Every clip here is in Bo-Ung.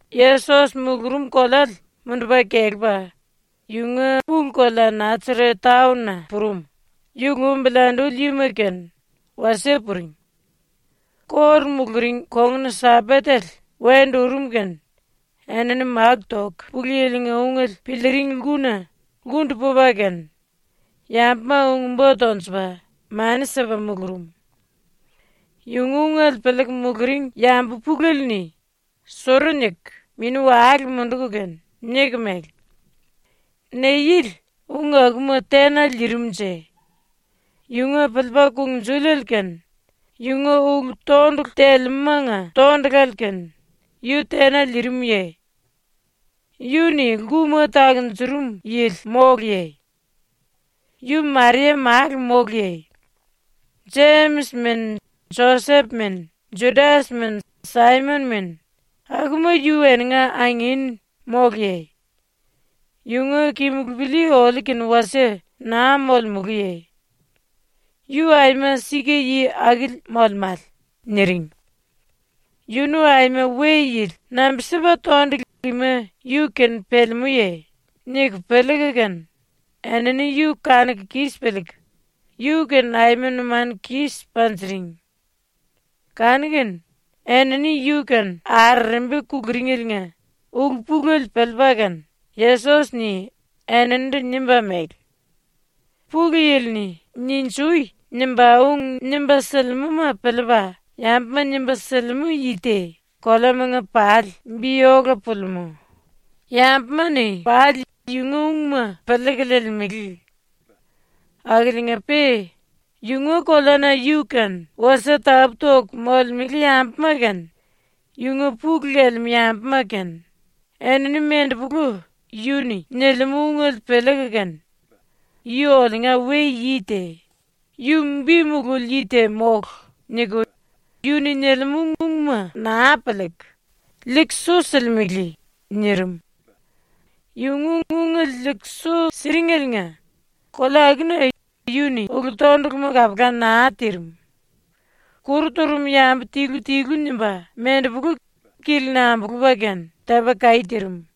Yesos mulurum koleale mundupa kelepa yunga pulu-kolea ⸤Nasaret taon-na⸥ purum, yu lumbili anduli yima kene wasie puring. ⸤Kóru muluring⸥ kongun-Sambatele wendu urum kene enini máku toku Pulu Yili-nga ungele piliiring lkuna lkundu pupa kene yambuma ung-bo tonjupa mani sipa mulurum. Yunga ungele piliiku muluring yambu pulele-ni suru niku mini-wale munduku kene niku mele: “Ne yili ung akuma tena liirimunje? Yunga piliipa kungnjuliele kene yunga ulu-tondulu telemúmanga tondulale kene yu tena liirimuye? Yu-ni lkuma takunjurum yili móluye? Yu Maria málu móluye? Jemis mene Josep mene, Judas mene Saimon mene, akuma yu eninga angin móluye? Yunga kimulupili oliu kene wasie naa molemuluye? ⸤Yu aima sika yi akili molemále⸥.” niring. ‘Yunu aima we-yili nambi-sipa tondulu ima yu-kene pelemúye?’ niku piliiku kene enini yu kanuku kis piliiku yu-kene aima numanu kis panjiring. Kanu-kene ⸤enini yu-kene arerembi kuluringeliinga ulu-pulele piliipa kene⸥ Yesos-ni eninindu nimba mele: “Pulu Yili-ni “Ninjui!” nimba ung nimba silimúma piliipa yambuma nimba silimú yi te koleamanga pali bi ola pulimú, yambuma-ni pali yunga ungma piliiku liilimele. Akiliinga-pe yunga koleana yu-kene wasie tapú-toku molemele yambuma kene, yunga pulu lelemú yambuma kene, enini mendepolu yu-ni nilimú ungele piliiku kene ‘Yu oliunga we-yi te. Yu bi mululi yi te mólu.’ niku yu-ni nilimú ungma naa piliiku, liiku su silimele.” nirim. ⸤Yunga ungele liiku su siringeliinga⸥ kolea akuna yu-ni ulu-tonduluma kapula naa tirim. Kuru turum yambu tilu-tilu nimba mendepolu kili-ni ambulupa kene tepa kaí tirim.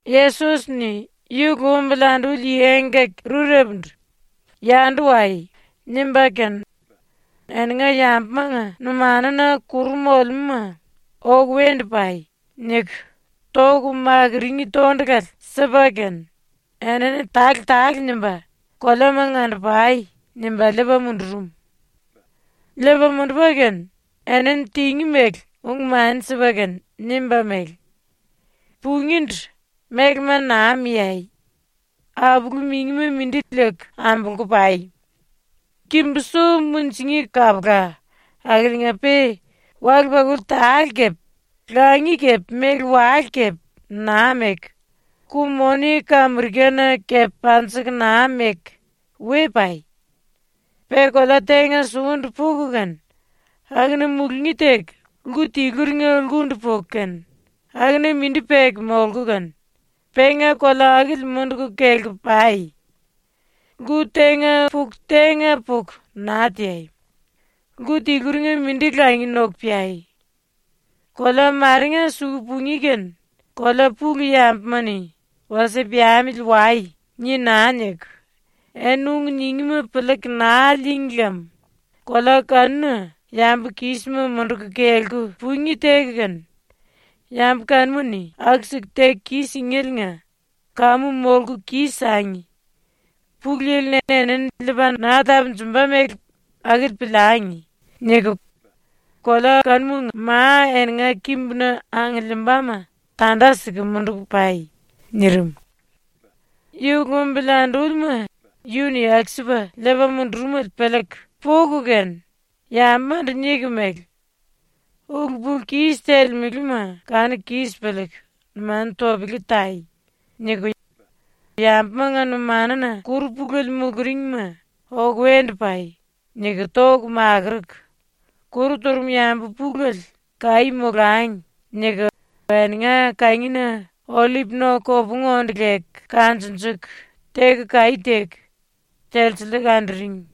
Yesos-ni yu lumbili anduli yi engkaki-rurepundu “Yandu wai.” nimba kene enini yambumanga numanuna kuru molemúma “Oku wendu pai.” niku toku makurungí tondulale sipa kene enini tale-tale nimba “Koleamanga ando-pai.” nimba liipa mundurum. ⸤Liipa mundupa kene⸥ enini tingí mele ung-mani sipa kene nimba mele: “Pungíndu mélema naa miai. Apulu-mingima mindi liiku ambolku pai. Kimbu-su munjingí kapula, akiliinga-pe wale-pakuli tale kepe langi kepe méle-wale kepe naa meku, ku-moni kamirikana kepe panjiku naa meku we pai. “Pe kolea tenga sukundu puku kene akuna mulungí teku lku tiluringa lkundu puku kene akuna mindi peku molku kene penga kolea akili munduku kelku pai. ⸤Lku tenga puku tenga puku naa teai. Lku tiluringa mindi langi noku peai.⸥ Kolea marenga suku pungí kene kolea pulu yambuma-ni “Wasie piamili wai.” ni naa niku eni ung ningíma piliiku naa lííngi lem kolea kanuna yambu kísima munduku kelku pungí teku kene ⸤yambu kanuma-ni aku-siku teku kis-singéliinga⸥ ‘Kamu molku kis-sangi. Pulu Yili-ni enini liipa naa tapunjumba mele akili piliangi.’ niku kolea kanumanga ma eninga kimbuna angiliimbama tanda siku munduku pai.” nirim. ⸤Yu lumbili andúlima yu-ni aku-sipa liipa mundurumele piliiku⸥ puku kene yambumandu niku mele: “Ulu-pulu-kis telemelema kanuku kis piliiku numanu topele tai.” niku yambumanga numanuna kuru pulele muluringma ⸤‘Oku wendu pai.’ niku⸥ toku makuruku, kuru turum yambu pulele ‘Kaí molangi.’ niku eninga kangina ollip no-kopungu onde leku kanjunjuku teku kaí teku, telsiliiku anduring.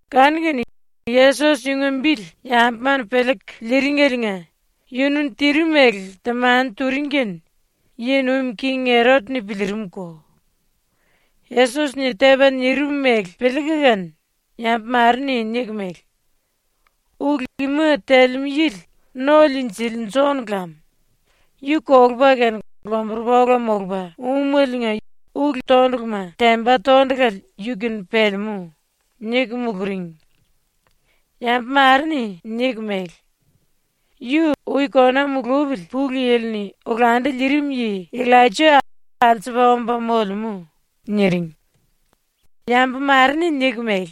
Kanu-kene Yesos yunga bili yambuma-ni piliiku liringeliinga yunu-ni tirim mele temani turing kene yi nuim king Erot-ni piliirimko. ⸤Yesos-ni tepa nirim mele piliiku kene⸥ yambu mare-ni niku mele: “Ulu ima telemú yili No-Liinjili Jon lam! Yu kolupa kene lomburupa ola molupa úmeliinga ulu-tonduluma temba tondulale yu-kene pelemú.” niku muluring. Yambu mare-ni niku mele: “Yu ⸤ui kona mulupili Pulu Yili-ni olandu liirim yi⸥ Illaija alsupa omba molemú.” niring. Yambu mare-ni niku mele: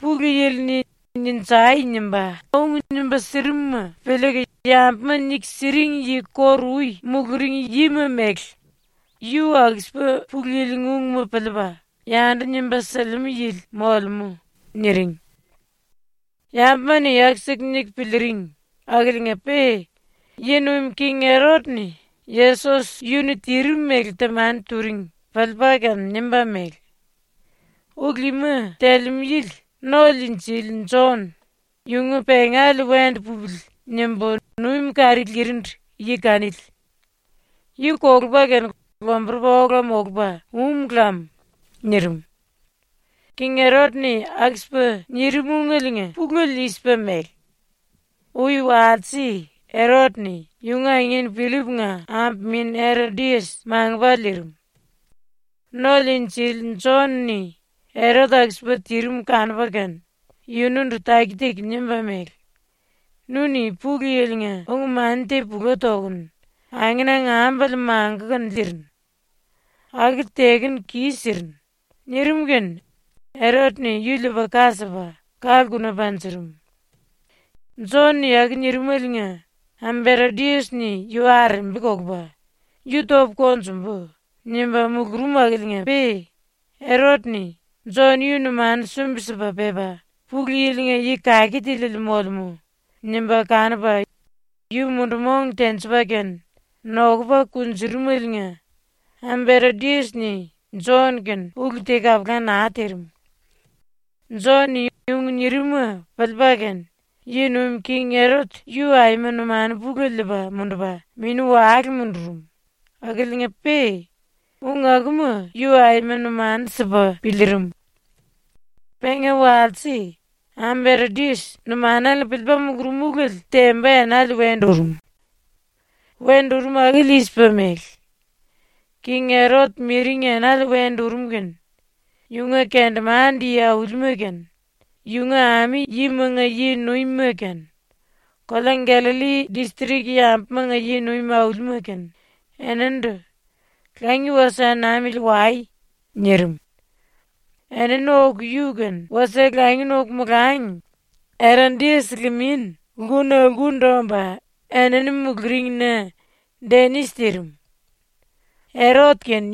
“Pulu Yili-ni “Ninjai!” nimba ung nimba sirimuma piliiku yambuma niku siring yi kóru-ui muluring yima mele yu aku-sipa Pulu Yili-nga ungma piliipa yandu nimba silimú yili molemú.” niring. ⸤Yambuma-ni aku-siku niku piliiring⸥ akiliinga-pe yi nuim king Erot-ni ⸤Yesos yu-ni tirim mele temani turing⸥ piliipa kene nimba mele: “Ulu ima telemú yili ⸤No-Liinjili⸥ Jon, ‘Yunga pengale wendu pupili.’ nimbu numi kari lirindu yi kanili. Yu kolupa kene lomburupa ola molupa um lam.” nirim. ⸤King Erot-ni aku-sipa nirim ungeliinga pulele i-sipa mele:⸥ Ui walse Erot-ni yunga angin Pillip-nga ambu min Erodias mangupa liirim. ⸤No-Liinjili⸥ Jon-ni Erot aku-sipa tirim kanupa kene yunundu taki-taki nimba mele: “Nu-ni ⸤Pulu Yili-nga⸥ ung-mani te pula tokunu angenanga ambale mangukunu liirinu. Akili tekunu kis-sirinu.” nirim kene Erot-ni yu liipa ka sipa ka-lkuna panjurum. Jon-ni aku nirimaliinga ambu Erodias-ni yu arerembi kolupa “Yu topu konjumbu.” nimba mulurum akiliinga-pe Erot-ni ‘Jon yu numanu sumbi-sipa pepa Pulu Yili-nga yi kake tiliele molemú.’ nimba kanupa yu mundu-mong tenjipa kene nokupa kunjurumeliinga ambu Erodias-ni Jon-kene ulu te kapula naa tirim. Jon-ni ung nirim-ma piliipa kene yi nuim king Erot yu aima numanu pulele liipa mundupa mini-wale mundurum akiliinga-pe ung akuma yu aima numanu sipa piliirim. Penga walse, ⸤ambu Erodias⸥ numanale-ni piliipa mulurum ulele temba enale wendu urum. Wendu urum akili i-sipa mele: King Erot miring enale wendu urum kene yunga kendemande-yi aulima kene, yunga ami-yimanga yi-nuimima kene, kolea Gallalli distrik yambumanga yi-nuim aulima kene, eninindu “Langi wasie namili wai.” nirim. ⸤Enini oku yu-kene wasie langi noku molangi⸥ Erodias limin lkuna lkundu omba enini muluringna denis tirim. Erot kene,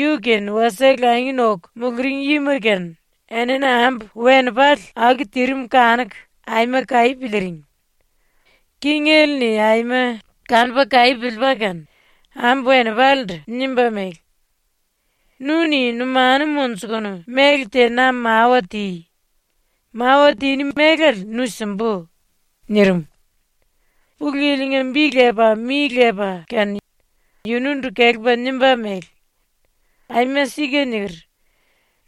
yu-kene wasie langi noku muluring yima kene enini ambu-wenipale aku tirim kanuku aima kaí piliiring. Kingele-ni aima kanupa kaí piliipa kene ambu-wenipalendu nimba mele: “Nu-ni numanu monjukunu méle te na mawa ti. Mawa tiní mélale nu simbu.” nirim. Pulu Yili-nga bi lepa mi lepa kene yunundu kelepa nimba mele: “Aima sika niker.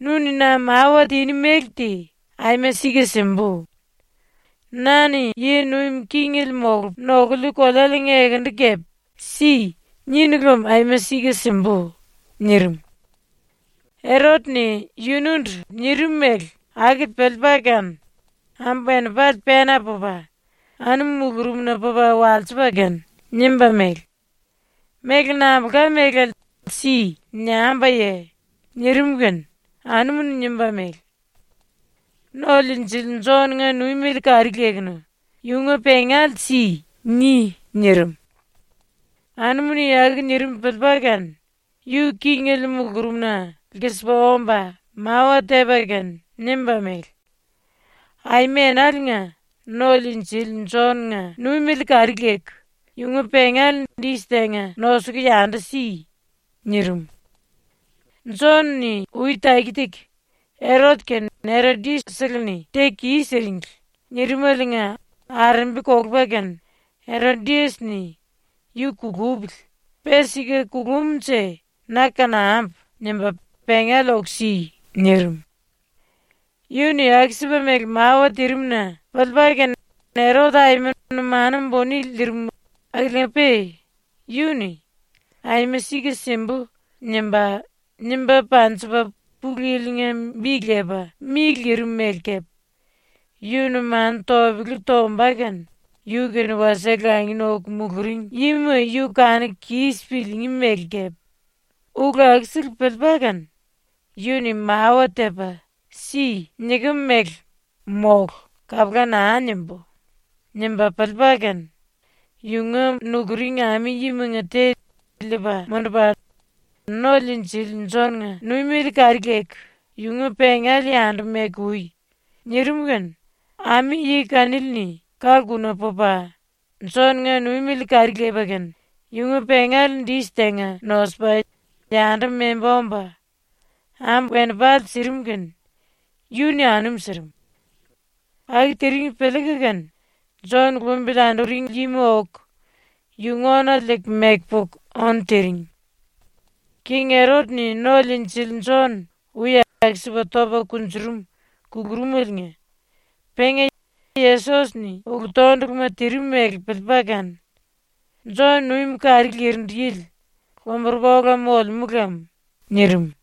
Nu-ni na mawa tiní méle te aima sika simbu. Na-ni yi nuim kingele molupu nokuliu kolealiinga ekendu kepe “Si.” ninu lem aima sika simbu.” nirim. Erot-ni yunundu nirim mele akili piliipa kene ambu-wenipale pena pupa, anum mulurumna pupa walsipa kene nimba mele: “Méle nambulka mélale ‘Si.’ niambuye?” nirim kene anumu-ni nimba mele: “ “No-Liinjili Jon-nga ⸤numiele kari lekunu yunga⸥ pengale si.” ni.” nirim. Anumu-ni aku nirim piliipa kene yu kingele mulurumna lkisipa omba mawa tepa kene nimba mele: “Aima enaliinga No-Liinjili Jon⸤-nga numiele kari leku⸥ yunga pengale dis tenga nosuku yandu si.” nirim. ⸤Jon-ni ui taki-taki “Erot kene Erodias-seleni teku kis-siringli.” nirimaliinga arerembi kolupa kene Erodias-ni ‘Yu kulupili. Pe sika kulumnje na kanambu.’ nimba “Pengale oku si.” nirim.⸥ Yu-ni aku-sipa mele mawa tirim-na piliipa kene Erot aima numanu buni lirim akiliinga-pe yu-ni “Aima sika simbu.” nimba, nimba panjipa Pulu Yili-nga bi lepa mi lirim mele kepe, yu numanu topele tomba kene yu-kene wasie langi noku muluring yima yu kanuku kis piliingí mele kepe, ulu akusele piliipa kene, “Yu-ni mawa tepa “Si.” nikem mele “Mólu.” kapula naa nimbú.” nimba piliipa kene yunga nukuring ami-yimanga te liipa mundupa “⸤No-Liinjili⸥ Jon⸤-nga numiele kari leku⸥ yunga pengale yandu meku ui.” nirim kene ami-yi kanili-ni ka-lkuna pupa Jon-nga numiele kari lepa kene yunga pengale dis tenga nosupa yandu memba omba ambu-wenipale sirim kene yu-ni anum sirim. Aku tiring piliiku kene Jon lumbili anduring yima oku yunga ónale liiku meku puku ónu tiring. ⸤King Erot-ni No-Liinjili Jon ui aku-sipa topa kunjurum kulurumeliinga penga Yesos-ni ulu-tonduluma tirim mele piliipa kene “Jon numi kari lirindu yili lomburupa ola molemú lem.” nirim.⸥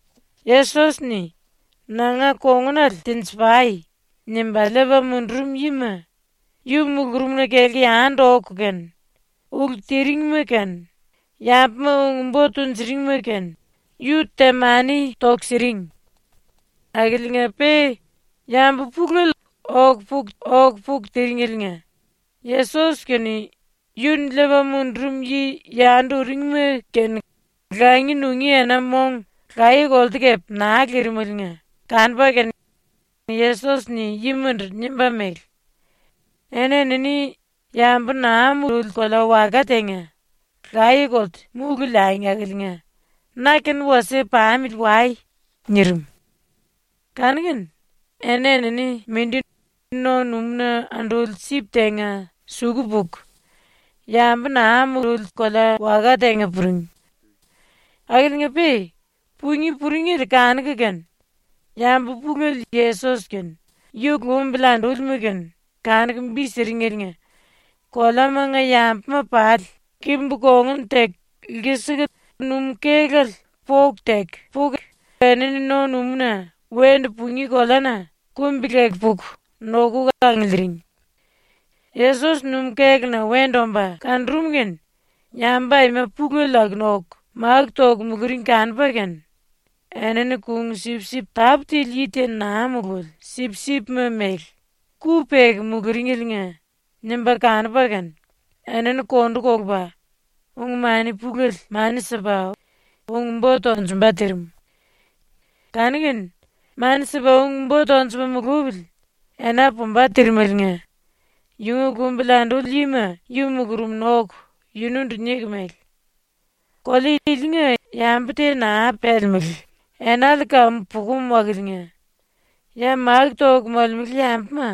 Yesos-ni “Nanga kongunale tenji-pai.” nimba liipa mundurum yima yu mulurumna kelku yandu oku kene, ulu tiringma kene yambuma ung-bo tunjuringima kene yu temani toku siring. Akiliinga-pe yambu pulele oku puku oku puku tiringeliinga Yesos kene ⸤yu-ni liipa mundurum yi yandu uringma⸥ kene langi nungí ena-mong laye-kolte kepe naa lirimeliinga kanupa kene Yesos-ni yimandu nimba mele: “Eni-enini yambu naa mululi kolea-waka tenga laye-kolte múlu liangi akiliinga na-kene wasie pamili wai.” nirim. Kanu-kene eni-enini mindi no-numúna anduli sip tenga suku puku yambu naa mululi kolea-waka tenga puring. Akiliinga-pe pungí puringele kanuku kene yambu pulele Yesos kene yu lumbili andúlima kene kanuku bi siringeliinga koleamanga yambuma pali kimbu kambiliikunu lkisiku numú-kélale poku teku puku enini no-numúna wendu pungí koleana kumbi-leku puku nokuku angiliiring. Yesos numú-kéluna wendu omba kanurum kene yambu aima pulele akuna oku máku toku muluring kanupa kene enini kung-sipsip tápu tili yi te naa mululi sipsipma mele ku peku muluringeliinga nimba kanupa kene enini kondu kolupa ung-mani pulele mani sipa ung-bo tonjumba tirim. Kanu-kene ⸤mani sipa ung-bo tonjupa mulupili⸥ ena pumba tirimeliinga yunga lumbili anduli yima yu mulurumna oku yunundu niku mele: “Kolea ilinga yambu te naa pelemelé, enale kamu pukum akiliinga ya máku toku molemele yambuma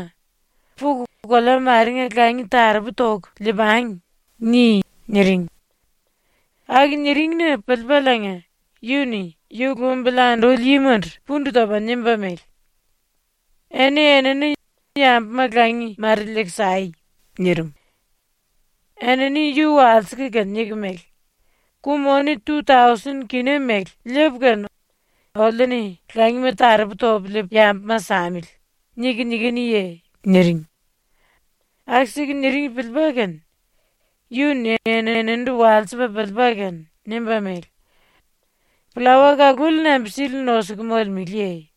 “Puku kolea marenga langi taropu toku lii-pangi.” ni.” niring. Aku niring-na piliipaliinga yu-ni ⸤yu lumbili anduli yimandu⸥ pundu topa nimba mele: “Eni-enini yambuma langi mare liiku sai.” nirim. Enini yu walsiku kene niku mele: “‘Ku-moni tu-tausen kina mele liipu kene oliu-ni langima taropu topu liipu yambuma samili.’ niku nikinuye?” niring. ⸤Aku-siku niring piliipa kene⸥ yu-ni eninindu walsipa piliipa kene nimba mele: “Pllawa kaluli nambi-sili nosuku molemeleye?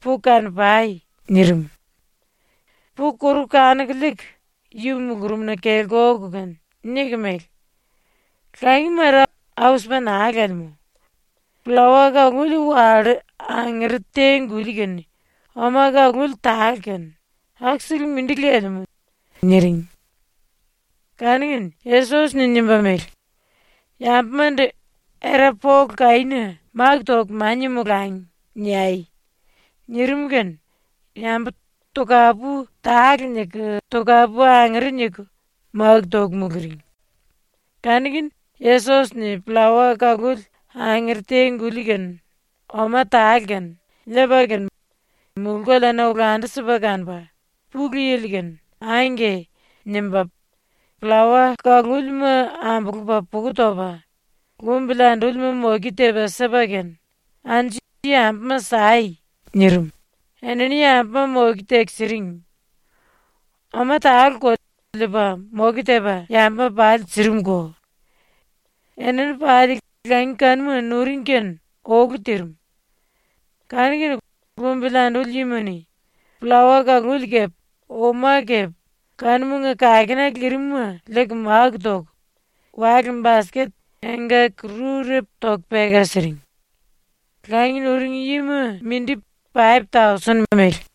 Puku kano-pai.” nirim. Puku koruku kanuku liiku yu mulurumna kelku oku kene niku mele: “Langi mare au-sipa naa lelemú. Pllawa kaluli wallú angere te-guli kene oma kaluli tale kene ⸤aku-sele mindi lelemú⸥.” niring. Kanu-kene Yesos-ni nimba mele: “Yambumandu “Era pole kaína máku toku mania molangi.” niai.” nirim kene yambu tokapu tale niku tokapu angere niku máku toku muluring. Kanu-kene Yesos-ni pllawa kaluli angere te-guli kene oma tale kene liipa kene mulú-koleana olandu-sipa kanupa ⸤Pulu Yili-kene⸥ “Angke” nimba pllawa kalúlima ambulupa puku topa lumbili andúlima moke tepa sipa kene “Anju yambuma sai.” nirim, ⸤enini⸥ yambuma ⸤moke teku siring⸥. Oma taleko liipa moke tepa yambuma pali sirimuko. Enini pali langi kanuma nuring kene olu tirim. Kanu-kene lumbili anduli yima-ni pllawa kaluli kepe oma kepe kanumanga kakena lirim-ma liiku máku toku wale-basket engkaki-rurepu toku peka siring. Langi nuring yima mindi paip-tausen mele.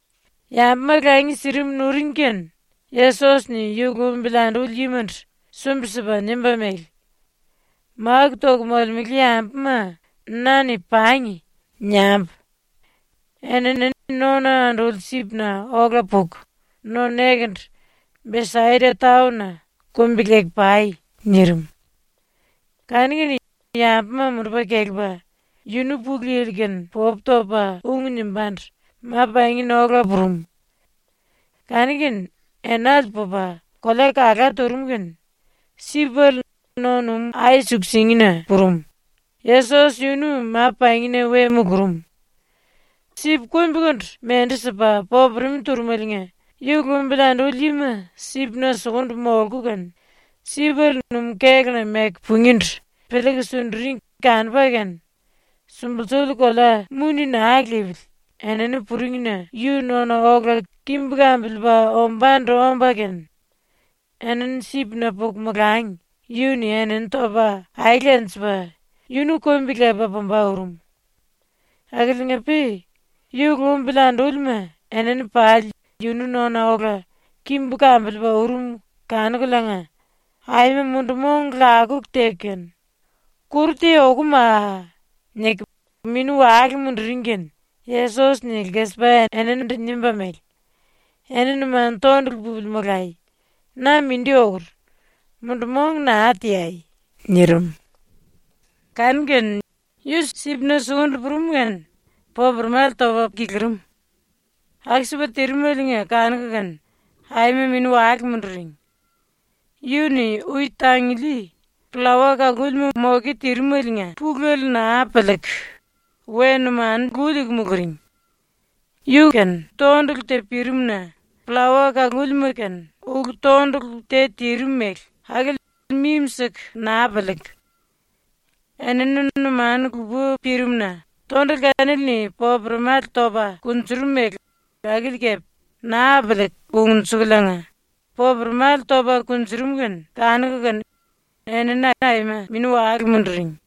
⸤Yambuma langi sirim nuring⸥ kene Yesos-ni yu lumbili anduli yimandu sumbi-sipa nimba mele: “Máku toku molemele yambuma na-ni “Pangi.” niambu. Enini nona anduli sipna ola puku no nekendu, Besaida taon-na, kumbi-leku pai.” nirim. Kanu-kene yambuma mundupa kelepa yunu Pulu Yili-kene popu topa ung nimbándu ma-pangina ola purum. Kanu-kene enale pupa kolea kala turum kene sipele no-numú ai-suku-singina purum, Yesos yunu ma-⸤pangi⸥na we mulurum. Sip kumbikundu mendu sipa popuremi turumeliinga ⸤yu lumbili anduli yima sipna sukundu molku kene⸥ sipele numú-kéluna meku pungíndu piliiku sunduring kanupa kene sumbulsuli kolea muni naa lipili enini puringna yu nona ola kimbu kambiliipa ombándu omba kene enini sipna puku molangi yu-ni enini topa aele lenjipa yunu kumbi-lepa pumba urum. Akiliinga-pe ⸤yu lumbili andúlima⸥ enini pali yunu nona ola kimbu kambiliipa urum kanukuliinga, aima mundu-mong lakuku teku kene “Kuru te okumaa!” niku mini-wale munduring kene Yesos-ni lkisipa eninindu nimba mele: “Eni numanu tondulu pupili molai. Na mindi okur. Mundu-mong naa teai.” nirim. Kanu-kene yu sipna sukundu purum kene popuremale topa kilirim. Aku-sipa tirimeliinga kanuku kene aima mini-wale munduring. Yu-ni ⸤ui tanguli⸥ pllawa kalúlima ⸤moke⸥ tirimeliinga pulele naa piliiku we numanu lu liiku muluring. Yu-kene tondulu te pirim-na pllawa kalulima-kene ulu-tondulu te tirim mele akili mimi-siku naa piliiku enini numanu lupa pirimu-na tondulu kanili-ni popuremale topa kunjurum mele akili kepe naa piliiku kungnjukuliinga popuremale topa kunjurum kene kanuku kene enini aima mini-wale munduring.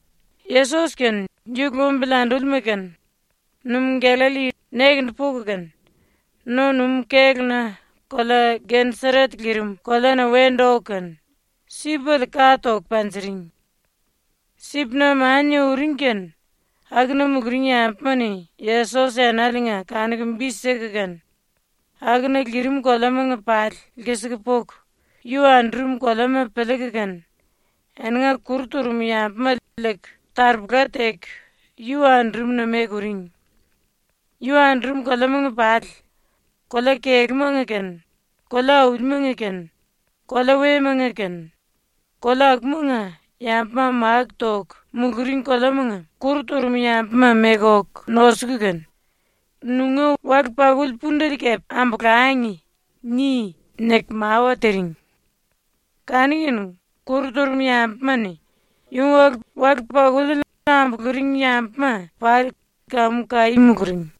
⸤Yesos kene yu lumbili andúlima kene⸥ numú ⸤Gallalli⸥ nekendu puku kene no-numú kéluna kolea Geneseret lirim koleana wendu oku kene sipele ka toku panjiring. Sipna mania uring kene akuna muluring yambuma-ni Yesos enaliinga kanuku bi siku kene akuna lirim koleamanga pali lkisiku puku yu andurum koleama piliiku kene eninga kuru turum yambuma liiku taropola teku yu andurumna meku uring. Yu andurum koleamanga pali, kolea-kelúmanga kene, kolea-aulimanga kene, kolea wemanga kene, kolea akumanga yambuma máku toku muluring koleamanga kuru turum yambuma meku oku nosuku kene, “‘Nunga wale-pakuli pundele kepe ambolangi.’ ni.” niku mawa tiring. Kanu-kene kuru turum yambuma-ni yunga wale-pakuliele ambuluring yambuma pali kamu kaí muluring.